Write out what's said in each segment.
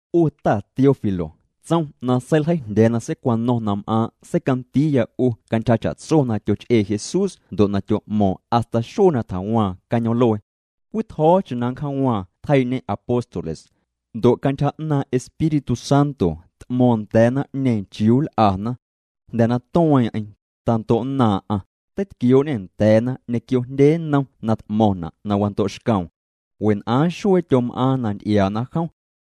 'U ta Teófilo, tsom na seiljeijndya̱a̱ na seicwano̱ⁿ na m'aaⁿ' seicandiiya 'u cantyja cha'tso na tyoch'ee Jesús ndo' na tyo'mo̱o̱ⁿ hasta xuee na tjawaaⁿ cañoom'luee. Cwii tjo̱o̱cheⁿ na nncjaawaaⁿ tjeii'ñê apóstoles. Ndo' cantyja 'naaⁿ' Espíritu Santo t'mo̱o̱ⁿ nda̱a̱ naⁿ'ñeeⁿ chiuu nl'ana. Jnda̱ na tueeⁿ'eⁿ, tando'nnaaⁿ'aⁿ, teitquioo'ñê nda̱a̱na ñequio jndye nnom na t'mo̱ⁿna' na wando'xcoom. Wen'aaⁿ xuee tyom'aaⁿ na nty'iaana jom.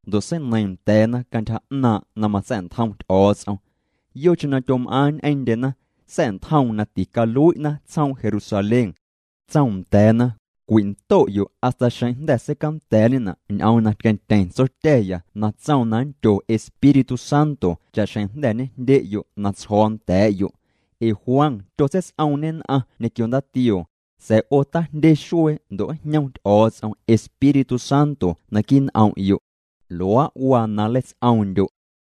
Ndo' seineiiⁿ nda̱a̱na cantyja 'naaⁿ' na matsa̱'ntjom Ty'o̱o̱ts'om. Yocheⁿ na tyom'aaⁿ ñ'eⁿndyena sa̱'ntjoom na ticalui'na tsjoom Jerusalén. Tsoom nda̱a̱na: —Cwindo'yo' hasta xeⁿ jnda̱ seicanda̱a̱'ñena' ñ'oom na tqueⁿtyeⁿ Tsotya̱ya na tsoom na nndyo Espíritu Santo cha'xjeⁿ jnda̱ ñejndye'yo' na tsjo̱o̱ nda̱a̱'yo'. Ee Juan tyotseits'oomñê nn'aⁿ ñequio ndaatioo, sa̱a̱ 'o tajndye xuee ndo' njñom Ty'o̱o̱ts'om Espíritu Santo naquii' n'om'yo'. Luaa' waa na nleits'oomndyo'.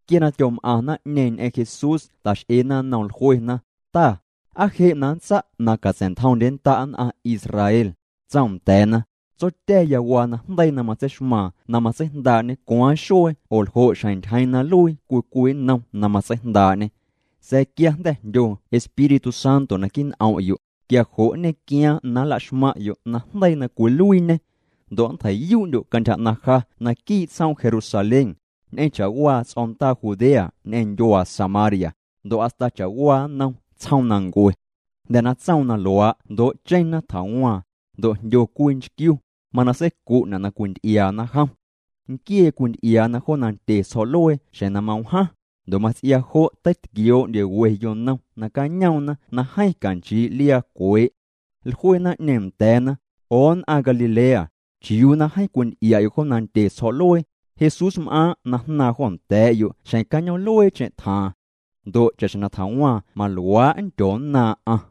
Quia na tyom'aⁿ naⁿ'ñeeⁿ ñ'eⁿ Jesús ta'x'eena nnoom, jluena: —Ta, ¿aa je' na nntsa' na catsa̱'ntjomndyennda' nn'aⁿ Israel? Tsoom nda̱a̱na: —Tsotya̱ya waa najndeii na matseixmaaⁿ na matseijndaa'ñê cwaaⁿ xuee oo ljo' xjeⁿ ntyjeeⁿ na nluii cwii cwii nnom na matseijndaa'ñê. Sa̱a̱ quia na jnda̱ jndyo Espíritu Santo naquii' n'om'yo', quia jo' nñequiaaⁿ na nlaxmaⁿ'yo' najndeii na cwiluiiñê. Ndo' nntjei'yuu'ndyo' cantyja 'naⁿ ja naquii' tsjoom Jerusalén, ñ'eⁿ cha'waa ts'o̱ndaa Judea ñ'eⁿ ndyuaa Samaria, ndo' hasta cha'waa nnom tsjoomnancue. Jnda̱ na tsoom na luaa' jndoo'cheⁿna tjawaaⁿ. Ndo' jndyo cwii nchquiu, mana seicu'na' na cwinty'iaana jom. Nquiee cwinty'iaana jo nandye tsjo̱'luee xjeⁿ na mawjaaⁿ, ndo' mats'iaa jo' teitquioo'ndye we yonom nacañoomna na jeeⁿ canchii' liaa cwee'. Jlue naⁿ'ñeeⁿ nda̱a̱na: —'O nn'aⁿ Galilea, ¿chiuu na jeeⁿ cwinty'ia'yo' jo nandye tsjo̱'luee? Jesúsm'aaⁿ' na jnaaⁿ jo nda̱a̱'yo' xjeⁿ cañoom'lueecheⁿ tjaaⁿ. Ndo' cha'xjeⁿ na tjawaaⁿ maluaa' nndyonnaaⁿ'aⁿ.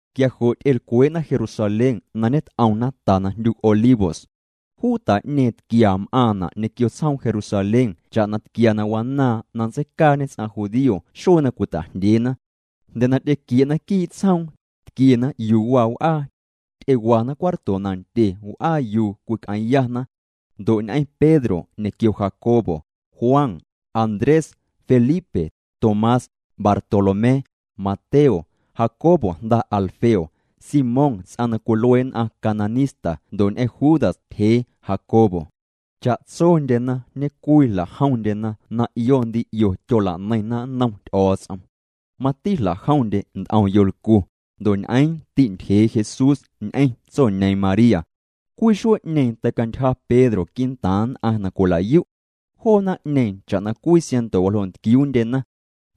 Quia jo' ty'elcwee'na Jerusalén na ñet'omna ta na jndyu Olivos. Juu ta'ñeeⁿ tquia m'aaⁿna' ñequio tsjoom Jerusalén cha'na tquia na wanaaⁿ na nntseicaañe ts'aⁿ judío xuee na cwita'jndyeena. Jnda̱ na ty'equie'na quii' tsjoom, tquiena yuu waa w'aa. Ty'ewana cuarto nandye w'aa yuu cwic'eeⁿyana. Ndo' ñ'eⁿ Pedro ñequio Jacobo, Juan, Andrés, Felipe, Tomás, Bartolomé, Mateo, Jacobo jnda Alfeo, Simón ts'aⁿ na cwilue nn'aⁿ cananista ndo' ñ'eⁿ Judas tyjee Jacobo. Cha'tsondyena ñecwii jla'jomndyena na 'io ndi 'io tyolaneiⁿna nnom Ty'o̱o̱ts'om. Mati jla'jomndye nt'om yolcu, ndo' ñ'eeⁿ ti'ntyjee Jesús ñ'eⁿ tsoñeeⁿ María. Cwii xuee'ñeeⁿ teicantyja Pedro quii'ntaaⁿ nn'aⁿ na cwila'yu'. Joo naⁿ'ñeeⁿ cha'na cwii siaⁿnto waljoo' ntquiuundyena.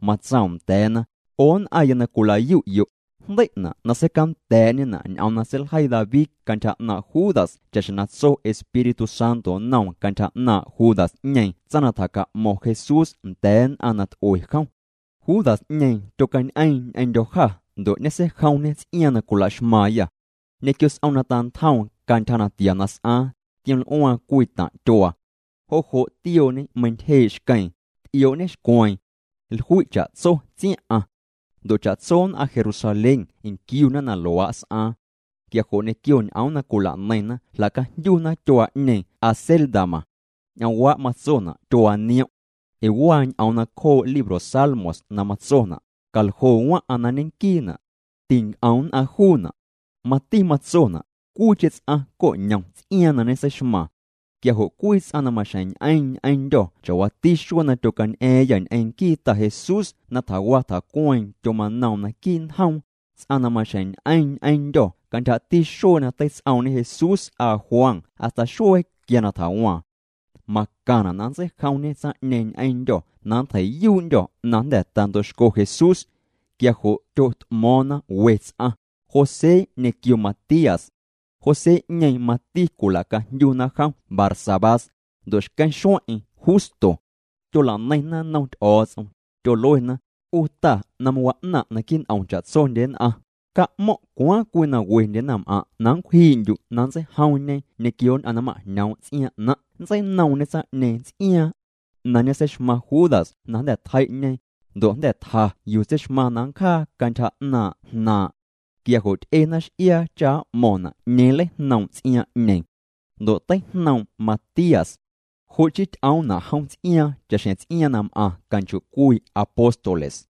Matsoom nda̱a̱na: —'O nn'aⁿya na cwilayu'yo', jndei'na' na seicanda̱a̱'ñena' ñ'oom na seiljeii David cantyja 'naaⁿ' Judas cha'xjeⁿ tso Espíritu Santo nnoom cantyja 'naaⁿ' Judas'ñeeⁿ tsaⁿ na tjaca'mo̱ⁿ Jesús nda̱a̱ nn'aⁿ na t'ue jom. Judas'ñeeⁿ tyocañ'eeⁿ ñ'eⁿndyô̱ jâ ndo' ñeseijomñê ts'iaaⁿ na cwilaxmaaⁿyâ. Ñequio s'om na tantjoom cantyja natia na s'aaⁿ, tioml'uaaⁿ cwii taⁿ' tyuaa. Jo' jo' tiooñê meintyjee' xqueeⁿ, t'ioo'ñexcweeⁿ. Jlui' cha'tso tsiaⁿ'aⁿ. Ndo' cha'tso nn'aⁿ Jerusalén nquiuna na luaa' s'aaⁿ. Quia jo' ñequio ñ'oom na cwila'neiⁿna jla'cajndyuna tyuaa'ñeeⁿ Acéldama. Ñ'oomwaa' matsona' Tyuaa Niom'. Ee waa ñ'oom nacjoo' libro Salmos na matsona': Caljo waⁿ'aⁿ na ñeⁿnquiina'. Tinc'om nn'aⁿ juuna'. Mati matsona': Cwiicheⁿ ts'aⁿ coñom ts'iaaⁿ na ñeseixmaaⁿ. ’Quia jo' cwii ts'aⁿ na maxjeⁿ ñ'eeⁿ ñ'eⁿndyô̱ cha'waati xuee na tyocañ'a̱a̱ⁿyâ ñ'eⁿ nquii Ta Jesús na tjawa tjacueeⁿ tyomanoom naquii' njoom, ts'aⁿ na maxjeⁿ ñ'eeⁿ ñ'eⁿndyô̱ cantyjati xuee na teits'oomñe Jesús s'aa Juan hasta xuee quia na tjawaaⁿ. Macaⁿna' na nntseijomñê tsaⁿ'ñeeⁿ ñ'eⁿndyô̱ na nntjei'yuu'ndyô̱ na jnda̱ tando'xco Jesús. Quia jo' tyot'mo̱o̱ⁿna we ts'aⁿ, José ñequio Matías. José'ñeeⁿ mati cwila'cajndyuna jom Barsabás, ndo' xqueⁿ xueⁿ'eⁿ Justo. Tyolaneiⁿna nnom Ty'o̱o̱ts'om, tyoluena: —'U Ta na mawa'naⁿ' naquii' n'om cha'tsondye nn'aⁿ, ca'mo̱ⁿ' cwaaⁿ cwii na wendye naⁿm'aⁿ' na nncwjii'ndyu' na nntseijomñe ñequio nn'aⁿ na ma'jñoom' ts'iaaⁿ 'naⁿ'. Nntseinoomñe tsaⁿ'ñeeⁿ ts'iaaⁿ na ñeseixmaⁿ Judas na jnda̱ tjei'ñe, ndo' jnda̱ tja yuu tseixmaⁿ na nncjaa cantyja 'naaⁿ' jnaaⁿ'. Quia jo' ty'ena x'iaa cha m'mo̱ⁿna' 'ñeeⁿ nleijnoom' ts'iaaⁿ'ñeeⁿ. Ndo' teijnoom' Matías. Jo' chii ty'oomna' jom ts'iaaⁿ cha'xjeⁿ ts'iaaⁿ na m'aⁿ canchoo'cwii apóstoles.